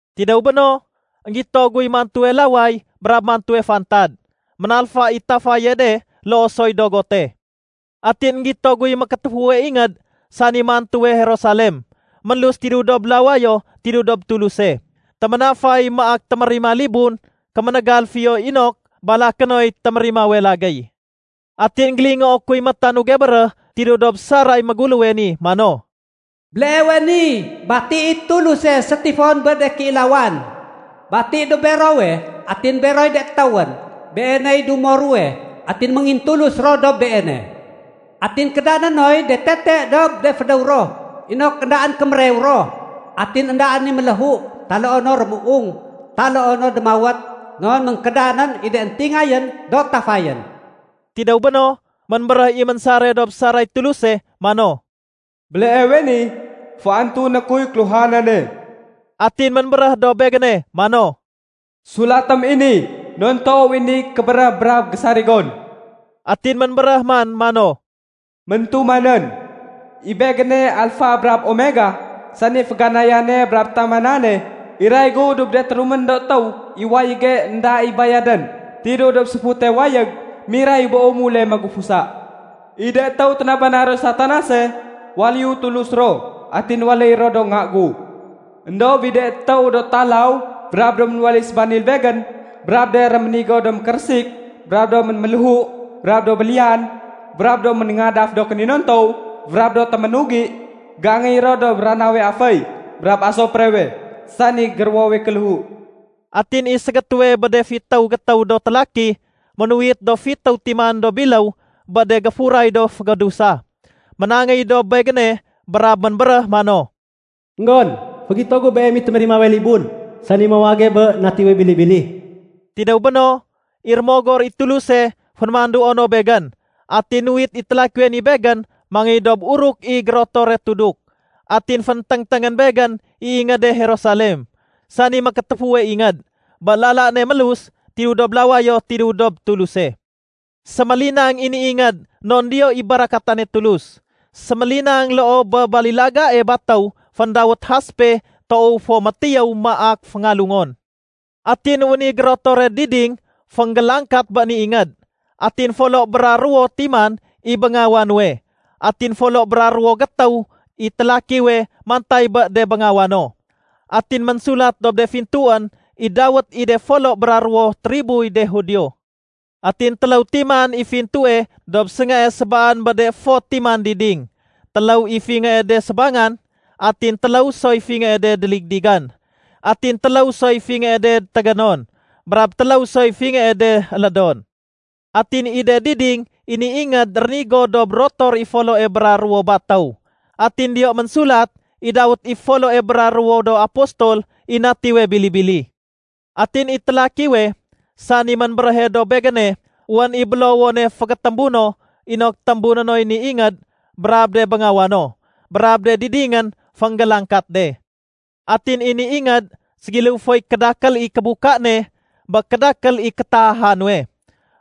Tidéw béno, énggito guy mantuwe laway brab mantuwe fantad. Ménalfa i tafaye de loo soy dogote. Atin énggito guy mékétéfuwe ingéd, sani mantuwe Jerusalem, ménlus tidéw dob lawayo tidéw dob Tuluse. Téménafay maak témérima libun kéménégal fiyo inok balaké noy témérimawe lagéy. Atin énggélingoo kuy métanuge béréh tidéw dob saray méguléwe ni mano, “Béleewe ni bati i Tuluse sétifon bé de kéilawan. Bati dob berowe atin beroy de étéwén. Beeney dumo ruwe atin méngintulus ro dob Beene. Atin kédané noy de tete dob de fédéw ro inok éndaén kémérew ro. Atin éndaén i méléhu taloo no rémuung taloo no démawét non ménkédanén i de éntingayén do tafayén.” Tidéw béno, ménbéréh i ménsare dob saray Tuluse mano, “Béleewe ni, féantuné kuy kéluhanane.” Atin ménbéréh dob begéne mano, “Sulatém i ni non toow i ni kébéréh brab gésarigon.” Atin ménbéréh man mano, “Méntumanén. I Begéne Alfa brab Omega, sani féganayane brab tamanane. Iray gu dob de térumén do étéw i wayége énda i bayadén tidéw dob séfute wayég miray bé umule magufusa. I de étéw ténabana roy Satanase, waléyu Tulus ro atin waléy ro do nga gu. Endob i de étéw do talaw brab do ménwaléy sébanil Begén brab de réménigo do mékérésik brab do ménméléhu brab do béliyan brab do ménéngadaf do kéninontow brab do téménugi, géangéy ro dob ranawe aféy brab asuprewe, sani géruwowe kéléhu.” Atin i ségétéwe bé de fitéw gétéw do télaki ménuwit do fitéw timan do biléw bé de géfuray do fégédusa, ménangéy dob begéne brab ménbéréh mano, “Enggon, fégito gu beem i témérimawe libun, sani mawage bé Natiwe Bili-bili.” Tidéw béno, i Rémogor i Tuluse fénémanduo no begén atin nuwit i télakiwe ni begén mangéy dob uruk i gérotore tuduk. Atin fénténgténgén begén i ingéde Jerusalem, sani mékétéfuwe ingéd, bé lala ne mélus tidéw dob lawayo tidéw dob Tuluse. Sémélinang i ni ingéd non diyo i barakatane Tulus. Sémélinang loo bé balilagae batéw féndawét haspe toow fo métiyéw maak féngalungon. Atin wén i gérotore diding fénggélangkat bé ni ingéd. Atin folo bra ruwo timan i béngawa nuwe. Atin folo bra ruwo gétéw i télakiwe mantay bé de béngawa no. Atin ménsulat dob de fintuén i dawét i de folo bra ruwo triboy de Judio. Atin téléw timan i fintue dob séngae sébaan bé de fot timan diding. Téléw i fingée de sébangan, atin téléw soy fingée de déligdigan. Atin téléw soy fingée de tégénon, brab téléw soy fingée de élédon. Atin i de diding i ni ingéd rénigo dob rotor i foloe bra ruwo batéw. Atin diyo ménsulat i dawét i foloe bra ruwo do apostol i Natiwe Bili-bili. Atin i télakiwe, sani ménbéréhe dob begéne, wén i bélowone fégétémbu no inok témbuné noy ni ingéd brab de béngawa no, brab de didingén fénggélangkat de. Atin i ni ingéd ségiléw foy kédakél i kébuka ne bé kédakél i kétaaha nuwe.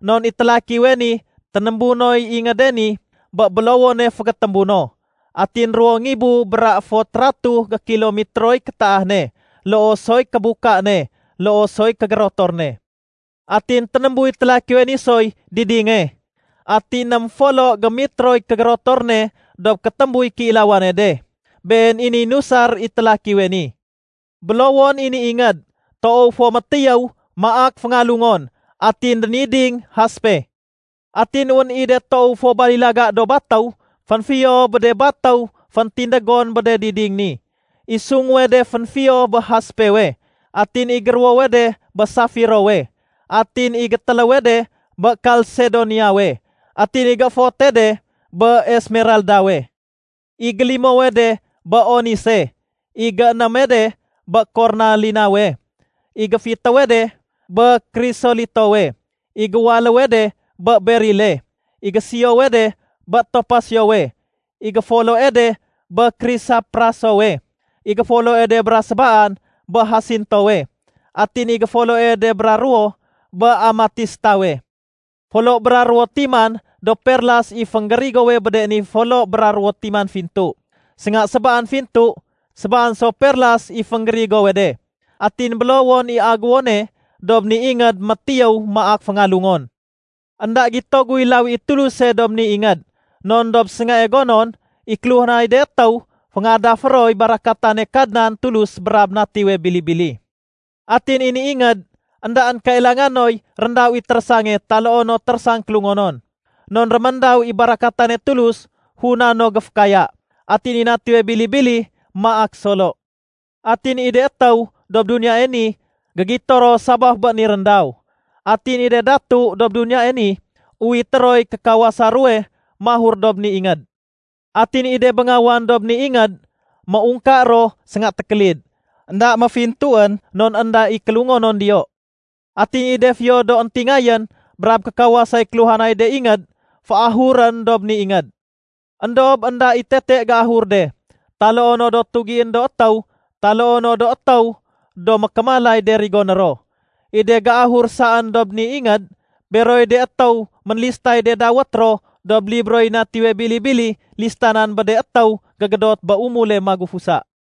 Non i télakiwe ni ténémbu noy ingéde ni bé bélowone fégétémbu no. Atin ruwo ngibu bra fot ratuh gékilometroy kétaah ne loo soy kébuka ne loo soy kégérotor ne. Atin ténémbuy télakiwe ni soy didinge, atin ném folo gémitroy kégérotor ne dob kétémbuy kéilawane de, been i niy nusar i télakiwe ni. Bélowon i ni ingéd toow fo métiyéw maak féngalungon, atin déniding haspe. Atin wén i de toow fo balilaga do batéw fénfiyo bé de batéw féntindégon bé de diding ni. I sunguwe de fénfiyo bé haspewe, atin i géruwowe de bé safirowe, atin i gétéléwe de bé kalsedoniawe, atin i gééfote de bé esmeraldawe. I gélimowe de bé onise, i généme de bé kornalinawe, i géfitéwe de bé krisolitowe, i géwaléwe de bé berile, i gésiyowe de bé topasyowe, i géfoloe de bé krisaprasowe, i géfoloe de bra sébaan bé hasintowe, atin i géfoloe de bra ruwo bé amatistawe. Folo bra ruwo timan do perlas i fénggérigowe bé de ni do folo bra ruwo timan fintu. Sénga sébaan fintu, sébaan so perlas i fénggérigowe de. Atin bélowon i aguwone dob ni ingéd métiyéw maak féngalungon. Enda gito guy lawi i Tuluse dob ni ingéd non dob séngae gonon, i kéluhanay de étéw féngadafé roy barakatane Kadnan Tulus brab Natiwe Bili-bili. Atin i ni ingéd, éndaén kailanga noy réndaw i térésange taloo no térésang kélungonon. Non réméndaw i barakatane Tuluse funa no géfékaya. Atin i Natiwe Bili-bili maak solo. Atin i de étéw dob duniyae ni, gégito ro sabaf bé ni réndaw. Atin i de datu dob duniyae ni, uwité roy kékawasa ruwe mahur dob ni ingéd. Atin i de béngawan dob ni ingéd, méungka ro sénga tékélid. Enda méfintuén non énda i kélungonon diyo. Atin i de fiyo do éntingayén brab kékawasay kéluhanay de ingéd, féahurén dob ni ingéd. Endob énda i tete géahur de, taloo no do tugién do étéw taloo no do étéw do mékémalay de rigoné ro. I de géahur saén dob ni ingéd, beroy de étéw ménlistay de dawét ro dob libroy Natiwe Bili-bili listanan bé de étéw gégédot bé umule magufusa.